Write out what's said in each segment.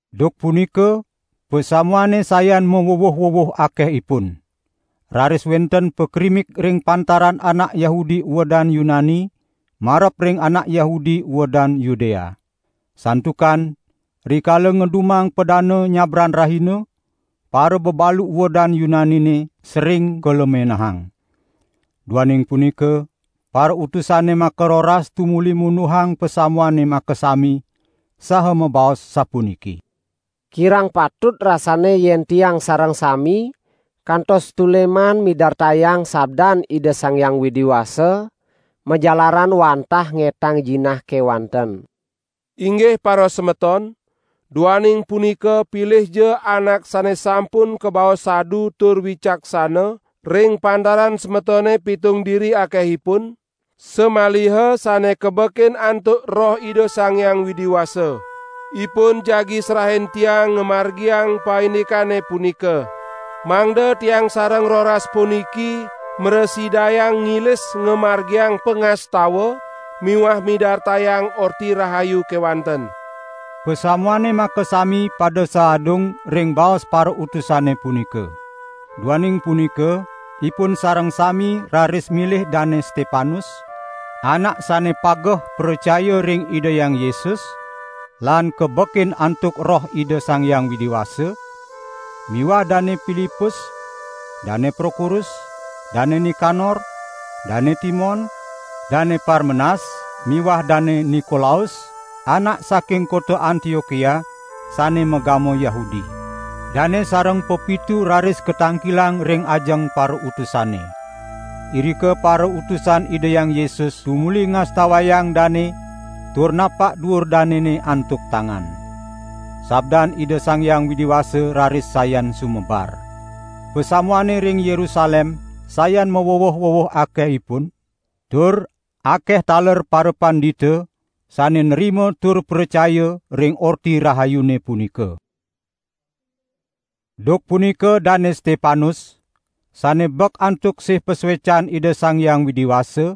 Duk punika pasamuane sayan mawuwuh-wuwuh akehipun. Raris wenten pakrimik ring pantaran anak Yahudi uedan Yunani marep ring anak Yahudi uedan Yudea. Santukan rikala ngedumang padana nyabran rahina, parabebalu uedan Yunanine sering kalemenahang. Duaning punika parautusane makaroras tumuli munduhang pasamuane makasami, saha mabaos sapuniki: "Kirang patut rasanne yen tiang sareng sami kantos tuleman midartayang sabdan Ida Sang Hyang Widi Wasa, majalaran wantah ngetang jinah kewanten. Inggih parasemeton, duaning punika pilihja anak sane sampun kabaos sadu tur wicaksana ring pantaran semetone pitung diri akehipun, samaliha sane kabekin antuk Roh Ida Sang Hyang Widi Wasa. Ipun jagi serahin tiang ngamargiang paindikane punika. Mangda tiang sareng roras puniki mrasidayang ngilis ngamargiang pangastawan miwah midartayang Orti Rahayu kewanten." Pasamuane makasami pada saadung ring baos parautusane punika. Duaning punika ipun sareng sami raris milih Dane Stepanus, anak sane pageh pracaya ring Ida Hyang Yesus lan kabekin antuk Roh Ida Sang Hyang Widi Wasa miwah Dane Pilipus, Dane Prokorus, Dane Nikanor, Dane Timon, Dane Parmenas miwah Dane Nikolaus anak saking kota Antiokia sane magama Yahudi. Dane sareng pepitu raris katangkilang ring ajeng parautusane. Irika parautusan Ida Hyang Yesus tumuli ngastawayang dane tur napak duur danene antuk tangan. Sabdan Ida Sang Hyang Widi Wasa raris sayan sumebar. Pasamuane ring Yerusalem sayan maweweh-weweh akehipun, tur akeh taler parapandita sane nrima tur pracaya ring Orti Rahayune punika. Duk punika Dane Stepanus sane bek antuk sih pasuecan Ida Sang Hyang Widi Wasa,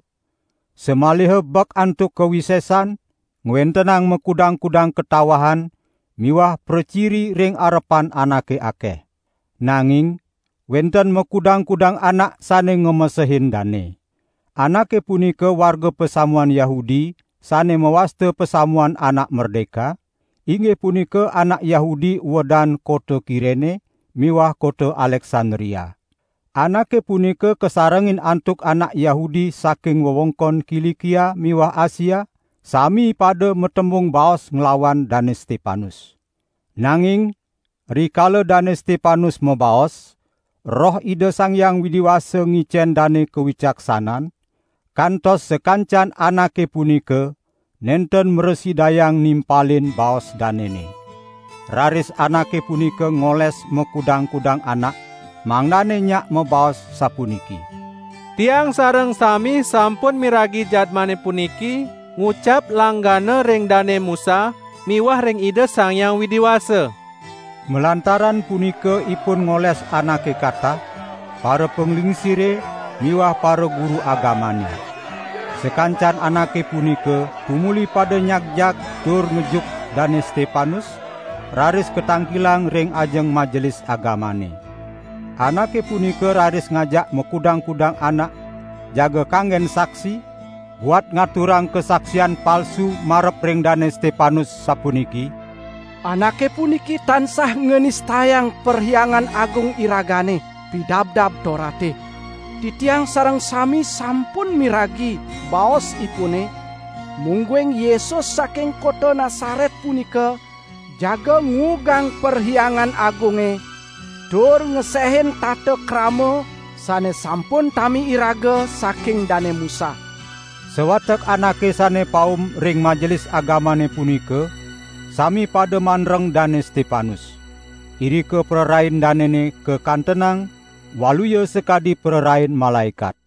samaliha bek antuk kawisesan, ngwentenang makudang-kudang katawahan miwah praciri ring arepan anake akeh. Nanging wenten makudang-kudang anak sane ngamesehin dane. Anake punika warga pasamuan Yahudi sane mawasta Pasamuan Anak Merdeka, inggih punika anak Yahudi uedan kota Kirene miwah kota Aleksandria. Anake punika kasarengin antuk anak Yahudi saking wewengkon Kilikia miwah Asia, sami pada matembung baos nglawan Dane Stepanus. Nanging rikala Dane Stepanus mabaos, Roh Ida Sang Hyang Widi Wasa ngicen dane kawicaksanan, kantos sakancan anake punika nenten mrasidayang nimpalin baos danene. Raris anake punika ngoles makudang-kudang anak, mangdane nyak mabaos sapuniki: "Tiang sareng sami sampun miragi jadmane puniki ngucap langgana ring Dane Musa miwah ring Ida Sang Hyang Widi Wasa." Malantaran punika ipun ngoles anake katah, parapanglingsire miwah paraguru agamane. Sakancan anake punika tumuli pada nyagjag tur ngejuk Dane Stepanus, raris katangkilang ring ajeng Majelis Agamane. Anake punika raris ngajak makudang-kudang anak jaga kanggen saksi, buat ngaturang kasaksian palsu marep ring Dane Stepanus, sapuniki: "Anake puniki tansah nganistayang Perhyangan Agung iragane, Pidabdab Torate. Titiang sareng sami sampun miragi baosipune mungguing Yesus saking kota Nasaret punika jaga nguugang Perhyangan Agunge, tur ngesehin tata krama sane sampun tami iraga saking Dane Musa!" Sawatek anake sane paum ring Majelis Agamane punika sami pada mandreng Dane Stepanus. Irika prarain danene kakantenang waluya sakadi prarain malaekat.